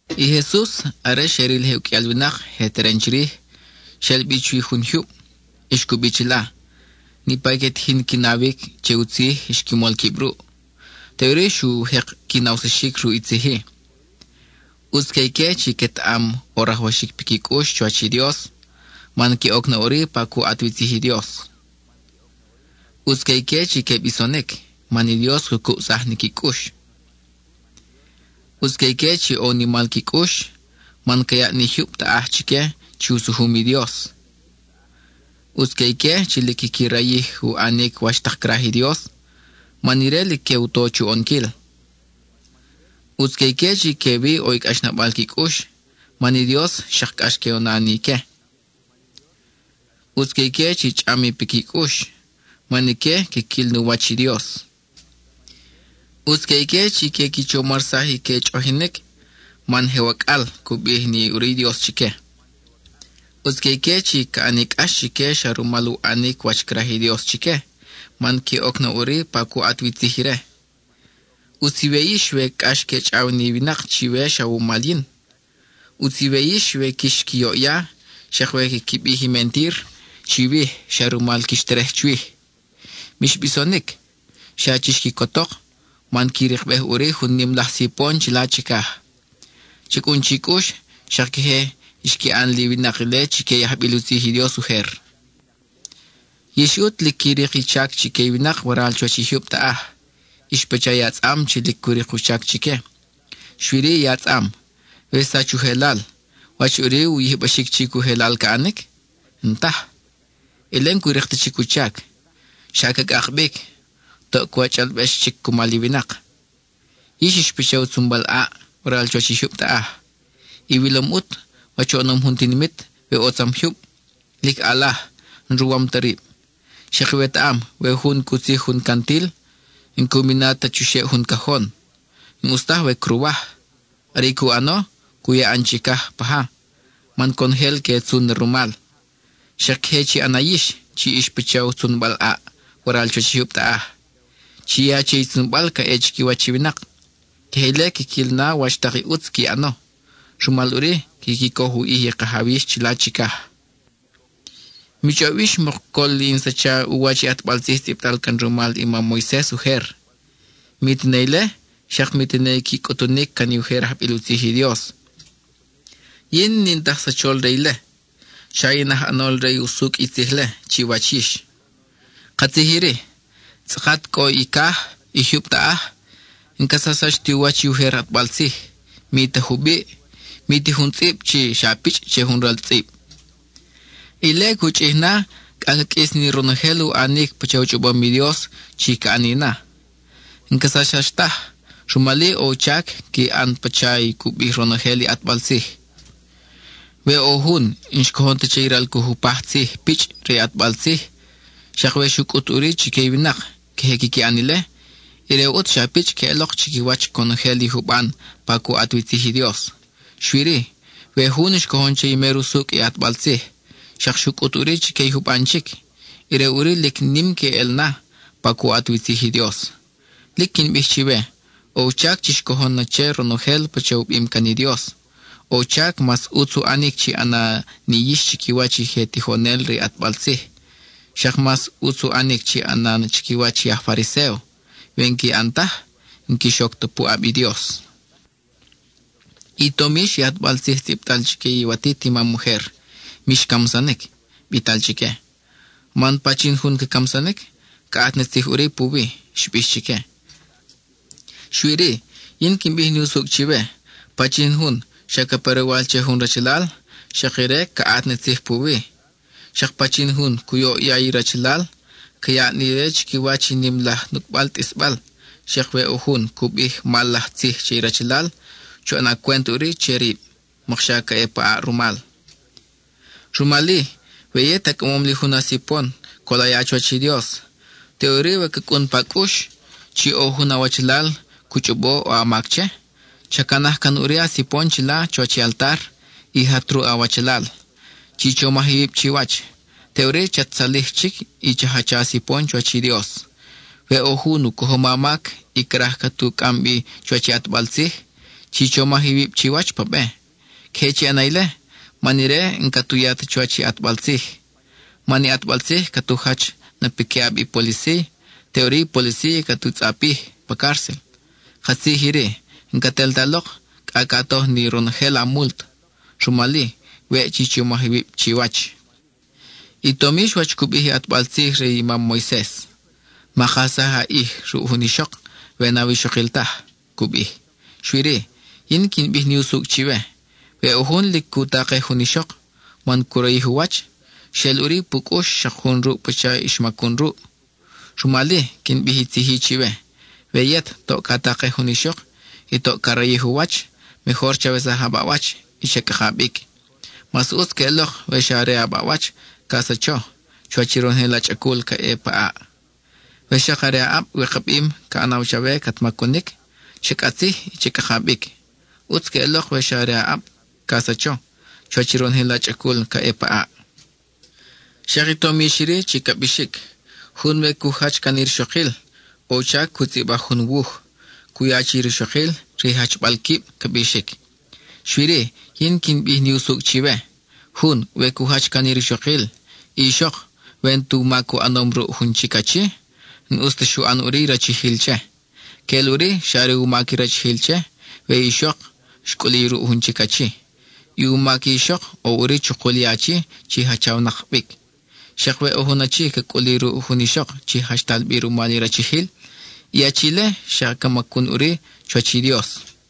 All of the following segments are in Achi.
I Jesus, are xe ril je uqʼuial winak je teren chirij, xel bi chuwi jun jyub, y xcubi chila. Niʼpa i que tijin qui nawic che u tzij xqui mol quib ruʼ. Teʼuri xu jek qui nawsaxic ruʼ i tzij-i: —ʼUtz que ique chi quetaʼam ʼo rajwaxic piqui cʼux chuwach i Dios, man que oc na ʼuri pa cu ʼat wi tzij i Dios. ʼUtz que ique chi que bisonic, man i Dios cu cubsaj ni qui cʼux. ʼUtz que ique chi ʼo u nimal qui cʼux, man ca yaʼ ni jyub taʼaj chique chi u sujum i Dios. ʼUtz que ique chi lic quiqui rayij u ʼanic wach tak craj i Dios, man ire lic que u to chu ʼonquil. ʼUtz que ique chi quewi ʼo i cʼaxnabal qui cʼux, man i Dios xak cʼax que u na ni ique. ʼUtz que ique chi chʼam i piqui cʼux, man ique quiquil nu wach i Dios. ʼUtz que ique chi que qui chomarsaj i que chʼoʼojinic, man “je wacʼal” cu bij na ʼuri i Dios chique. ʼUtz que ique chi caʼani cʼax chique xa rumal u ʼanic wach craj i Dios chique, man que oc na ʼuri pa cu ʼat wi tzij ire. ʼUtz iwe yix we cʼax que chʼaw ni winak chiwe xa wumal yin. ʼUtz iwe yix we quix qui yoʼya, xak we quiqui bij i mentir chiwij xa rumal quix terej chwij. Mix bisonic, xa chix quicotok, man qui rikbej ʼuri jun nim laj sipon chila chicaj. Cha cʼun chi cʼux, xak queje xqui ʼan li winak ile chique i ajbil u tzij i Dios ujer. Yix ʼut lic qui rik i chac chique i winak waral chuwach i jyub taʼaj; ix pacha i atzʼam chi lic cu rik u chac chique. Xui-ri, i atzʼam, we xsach u jelal, ¿wach ʼuri u yijbaxic chic u jelal ca ʼanic? N-taj. Ile n-cu rik ta chic u chac; xa ca cʼak bic; toʼ ca wachʼalbex chic cumal i winak. Yix ix pacha u tzunbal ʼaʼ waral chuwach i jyub taʼaj. Iwilom ʼut wach oʼonom jun tinimit we ʼo tzam jyub; lic ʼalaj, n-ruwam ta rib. Xak iwetaʼam, we jun cu tzij jun cantil, n-que u mina ta chuxeʼ jun cajon; n-ʼus taj we cruwaj. Are i cu ʼano, cu ya ʼan chicaj paja, man conojel que tzun na rumal. Xak queje chi ʼana yix, chi ix pacha u tzunbal ʼaʼ waral chuwach i jyub taʼaj, chi ya che i tzunbal ca ʼe chiquiwach i winak. Queje ile quiquil na wach tak i ʼutz qui ʼano. Rumal ʼuri, quiqui coj u ʼij i Kajaw yix chila chicaj. Mi chʼob yix mok col in sacha u wach i ʼatbal tzij tzʼibtal can rumal i mam Moises ujer; mi tene ile, xak mi tene i qui cʼutunic can i ujer ajbil u tzij i Dios. Yin n-in ta aj sachol re ile. Xa in aj ʼanol re i usucʼ i tzij-le chiwach yix. Katzij iri: tzʼakat cʼo i caj, i jyub taʼaj, n-ca sachsax ti u wach i ujer ʼatbal tzij, mi ta jubiʼ, mi ta jun tzʼib, mi ta pichʼ che jun ral tzʼib. Ile cu chʼij na cʼa ca qʼuis ni ronojel u ʼanic pacha u chʼobom i Dios chi ca ʼani na. N-ca sachsax taj; rumal-i, ʼo u chac qui ʼan na pacha i cu bij ronojel i ʼatbal tzij. We ʼo jun n-xcojon ta che i ral cu jupaj tzij pichʼ re i ʼatbal tzij, xak we xu cʼut ʼuri chique i winak queje quiqui ʼan ile, ire ʼut xa pichʼ queʼelok chiquiwach conojel i juban pa cu ʼat wi tzij i Dios. Xui-ri, we jun xcojon che i mer usucʼ i ʼatbal tzij, xak xu cʼut ʼuri chique i juban chic, ire ʼuri lic nim queʼel na, pa cu ʼat wi tzij i Dios. Lic quin bij chiwe, ʼo u chac chix cojon na che ronojel pacha u bim can i Dios; ʼo u chac mas ʼutz u ʼanic chi ʼana ni yix chiquiwach i je tijonel re i ʼatbal tzij; xak mas ʼutz u ʼanic chi ʼana na chiquiwach i aj Fariséo. We n-qui ʼan taj, n-quix oc ta puʼab i Dios. I tom yix i ʼatbal tzij bital chique iwatit imam ujer. “Mix camsanic,” bital chique, “man pachin jun ca camsanic, caʼat ni tzij ʼuri puwi,” xbix chique. Xui-ri, yin quin bij ni usucʼ chiwe: pachin jun xa ca pe roywal che jun rachalal, xak ire caʼat ni tzij puwi. Xak pachin jun cu yoʼya i rachalal, ca yaʼ ni ire chiquiwach i nim laj nucʼbal tʼisbal. Xak we ʼo jun cu bij mal laj tzij che i rachalal, chu ʼana cwent ʼuri che rib, mok xa ca ʼe pa ʼaʼ rumal. Rumal-i, we yet a cʼamom li jun a sipon col a ya chuwach i Dios, teʼuri we ca cʼun pa cʼux chi ʼo jun awachalal cu chʼobo ʼo a mac che, cha canaj can ʼuri a sipon chila chuwach i altar, y jat ruʼ awachalal. Chi chomaj iwib chiwach. Teʼuri chat tzalij chic y cha jacha a sipon chuwach i Dios. We ʼo jun u cojom a mac, y craj cat u cʼam bi chuwach i ʼatbal tzij, chi chomaj iwib chiwach pa be. Queje chi ʼana ile, man ire n-cat u ya ta chuwach i ʼatbal tzij. Man i ʼatbal tzij cat u jach na piquiʼab i policía; teʼuri i policía cat u tzʼapij pa cárcel. Katzij iri: n-cat el ta lok, cʼa ca toj ni ronojel a mult. (Rumal-i, weʼ chi chomaj iwib chiwach.) I tom yix wach cu bij i ʼatbal tzij re i mam Moises: “Ma kajsaj a ʼij ruʼ jun ixok, we n-awixokil taj,” cu bij. Xui-ri, yin quin bij ni usucʼ chiwe: we ʼo jun lic cu takej jun ixok, man cu rayij u wach, xeʼel ʼuri pu cʼux xak jun ruʼ pacha i xmacun ruʼ. Rumal-i, quin bij i tzij-i chiwe: we yet toʼ ca takej jun ixok y toʼ ca rayij u wach, mejor chawesaj a baʼwach y cha cʼaka bic Mas ʼutz queʼelok we xa are a baʼwach ca sacho, chuwach i ronojel a chʼacul ca ʼe pa ʼaʼ. We xak are a ʼab wikabim ca ʼanaw chawe cat macunic, cha cʼatzij y cha cʼaka bic. ʼUtz queʼelok we xa are a ʼab ca sacho, chuwach i ronojel a chʼacul ca ʼe pa ʼaʼ. Xak i tom yix iri chi ca bixic: “Jun we cu jach can i rixokil, ʼo u chac cu tzʼibaj jun wuj, cu ya che i rixokil, re i jachbal quib.” ca bixic. Xui-ri, yin quin bij ni usucʼ chiwe: jun, we cu jach can i rixokil, i ixok, we n-tu mac u ʼanom ruʼ jun chic achi, n-ʼus ta xu ʼan ʼuri i rachijil che. Queʼel ʼuri xa are u mac i rachijil che, we i ixok xcʼuli ruʼ jun chic achi; i u mac i ixok ʼo ʼuri chukul i achi chi jachawnak bic. Xak we ʼo jun achi ca cʼuli ruʼ jun ixok chi jachtal bi rumal i rachijil, i achi-le xak ca macun ʼuri chuwach i Dios.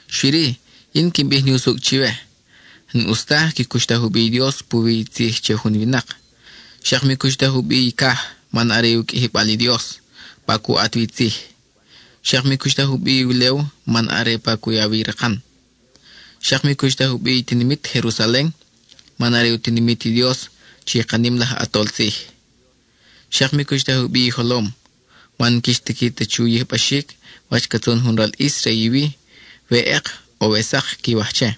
Xui-ri, yin quin bij ni usucʼ chiwe: n-ʼus taj qui cuxtaj u bi i Dios puwi i tzij che jun winak. Xak mi cuxtaj u bi i caj, man are u qʼuijibal i Dios, pa cu ʼat wi tzij. Xak mi cuxtaj u bi i ulew, man are pa cu ya wi i rakan. Xak mi cuxtaj u bi i tinimit Jerusalen, man are u tinimit i Dios chi ka nim laj ʼAtol Tzij. Xak mi cuxtaj u bi i jolom, man n-quix tiqui ta chu yijbaxic wach ca tzun jun ral ʼis re i wi, we ʼek ʼo we sak quiwaj che.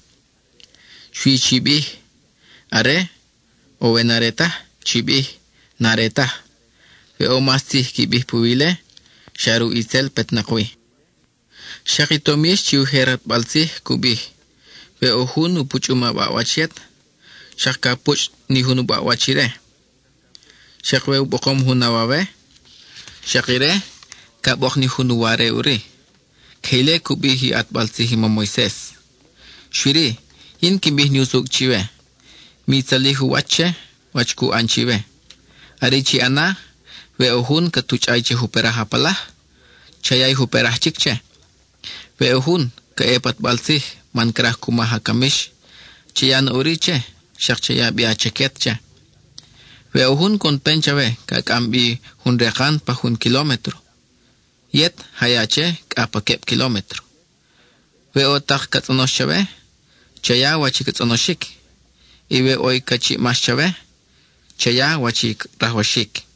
Xui chi bij “are”; o we n-are taj, chi bij “n-are taj”. We ʼo mas tzij qui bij puwi ile, xa ruʼ itzel petnak wi. Xak i tom yix chi i ujer ʼatbal tzij cu bij: “We ʼo jun u puchʼum a baʼwach yet, xak ca puchʼ ni jun u baʼwach ire ʼuri; xak we u bokom jun a wawe, xak ire ca bok ni jun u ware ʼuri.” Queje ile cu bij i u ʼatbal tzij i mam Moises. Xui-ri, yin quin bij ni usucʼ chiwe: mi tzalij u wach che, wach cu ʼan chiwe. Are i chi ʼana, we ʼo jun cat u chʼay che juperaj a palaj, cha ya i juperaj chic che. We ʼo jun ca ʼe pa ʼatbal tzij, man craj cu maj a camix, cha ya na ʼuri che, xak cha ya bi a chaquet che. We ʼo jun coʼon pen chawe ca cʼam bi jun rekan pa jun kilómetro, yet ja ya che cʼa pa queb kilómetro. We ʼo tak ca tzʼonox chawe, cha ya wach i ca tzʼonoxic. Y we ʼo i ca chiʼmax chawe, cha ya wach i rajwaxic.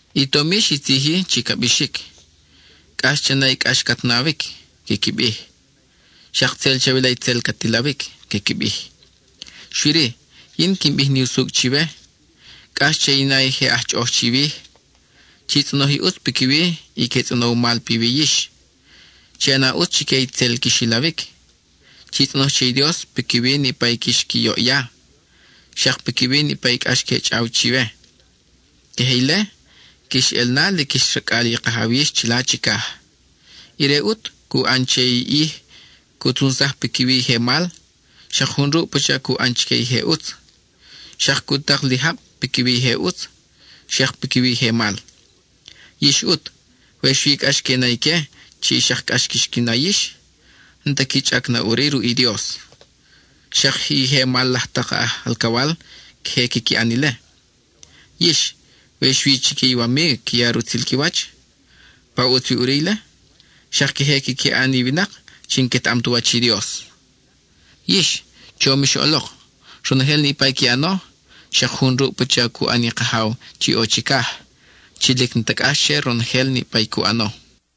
I tom yix i tzij-i chi ca bixic: “Cʼax cha na i cʼax cat nawic,” quiqui bij, “xak tzel chawila i tzel cat ilawic,” quiqui bij. Xui-ri, yin quin bij ni usucʼ chiwe: cʼax che i na i je aj chʼoʼoj chiwij; chi tzʼonoj i ʼutz piquiwi i que tzʼonow mal piwi yix; chi ʼana ʼutz chique i tzel quix ilawic; chi tzʼonoj che i Dios piquiwi niʼpa i quix qui yoʼya, xak piquiwi niʼpa i cʼax que chʼaw chiwe. Queje ile, quix ʼel na lic ix racʼal i Kajaw yix chila chicaj. Ire ʼut cu ʼan che i ʼij cu tzunsaj piquiwi i je mal, xak jun ruʼ pacha cu ʼan chique i je ʼutz. Xak cu tak li jab piquiwi i je ʼutz, xak piquiwi i je mal. Yix ʼut, we xui cʼax que i na ique chi xak cʼax quix qui na yix, n-ta qui chʼac na ʼuri ruʼ i Dios. Xak i je mal laj tak aj alcawal queje quiqui ʼan ile. Yix, we xui chique iwamig qui ya rutzil qui wach, ¿pa ʼutz wi ʼuri ile? Xak queje quiqui ʼan i winak chi n-quetaʼam tu wach i Dios. Yix, chom ix ʼolok, ronojel niʼpa i qui ʼano, xak jun ruʼ pacha cu ʼan i Kajaw chi ʼo chicaj, chi lic n-ta cʼax che ronojel niʼpa i cu ʼano.